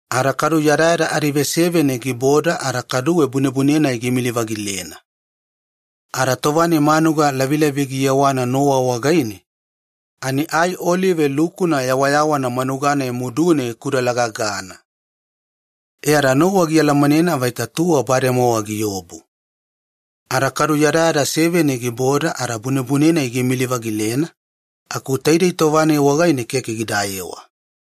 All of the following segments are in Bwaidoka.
Nowa giboda yadayada anaveseveni giavaidi muline, kaduwe bunebune-nai giimili-vagilena. Ada tova-nai manuga lavilaviya giyewana Nowa wagaine ani ai olive lukuna yawayawana manuga-nai mudune gikudalagagana! E ada Nowa gialamanena vaita tuwa bademowa giobu. Ada kaduwe giboda yadayada seveni giavaidi muline bunebune-nai giimili-vagilena, aku taidei tova-nai wagaine keke gidayewa.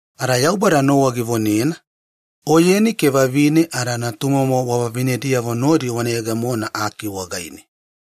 Ada Yaubada Nowa givonena, “Oyeni ke vavine ada natumomo wavavinediyavo nodi wana yegemona aki wagaine.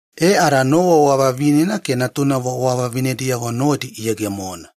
E ada Nowa wavavinena ke natunavo wavavinediyavo nodi iyegemona.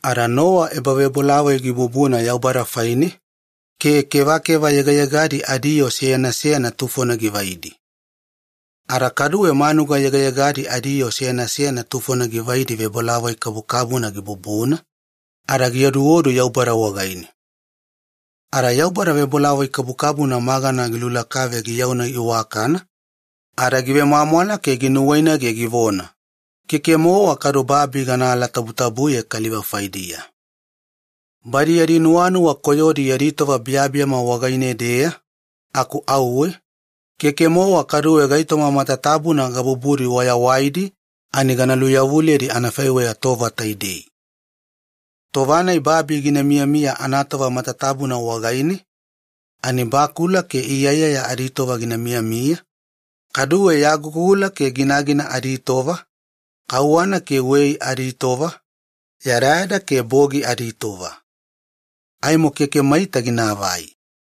Ada Nowa ebavebolavoi gibubuna Yaubada faine ke kevakeva yegayegadi adiyoo seyana seyana tufona givaidi. Ada kaduwe manuga yegayegadi adiyoo seyana seyana tufona givaidi vebolavoi kabukabuna gibubuna ada gioduodu Yaubada wagaine. Ada Yaubada vebolavoi kabukabuna magana gilulakave giyauna iwakana ada givemwamwala ke nuwainagene givona, “Keke-mowa kaduwe babi gana alatabutabuye kaliva faidiya. Badi yadi nuwanuwa koyodi yadi tova biyabiyama wagaine-deya, aku auwe, keke-mowa kaduwe gaitoma matatabuna gabubudi wayawaidi ani gana luveyawaliyedi anafaiweya tova taidei. “Tova-nai babi gina miyamiya anatova matatabuna wagaine ani bakula ke iyala aditova gina miyamiya, kaduwe yagugula ke ginagina aditova, kauwana ke wei aditova, yadayada ke bogi aditova. Aimo keke maita ginaavai.”